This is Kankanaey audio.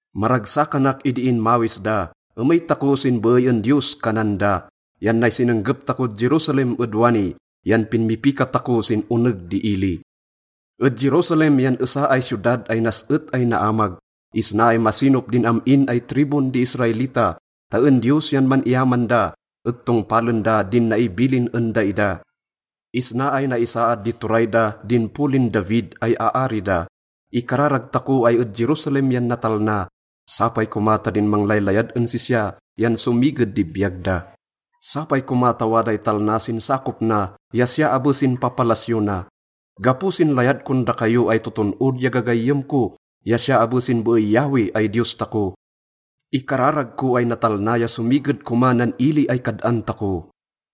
Maragsakanak idi inmawis da, “Emey tako sin beey en Diyos,” kanan da. Yan nay sinenggep takod Jerusalem ed wani, yan pinmipika tako sin oneg di ili. Ed Jerusalem yan esa ay siyodad ay nas-et ay naamag. Isna ay masinop din am-in ay tribun di Israelita ta en Diyos yan man-iyaman da et tongpalen da din naibilin en daida. Isna ay naisaad di turay da din polin David ay aari da. Ikararag tako ay ed Jerusalem yan natalna. Sapay koma ta din manglaylayad en sisya yan somiged di biyag da. Sapay koma ta waday talna sin sakop na ya siya abe sin papalasyo na. Gapo sin layad kon dakayo ay toton-od ya gagayyem ko ya siya abe sin beey Yahweh ay Diyos tako, ikararag ko ay natalna ya somiged koma nan ili ay kad-an tako.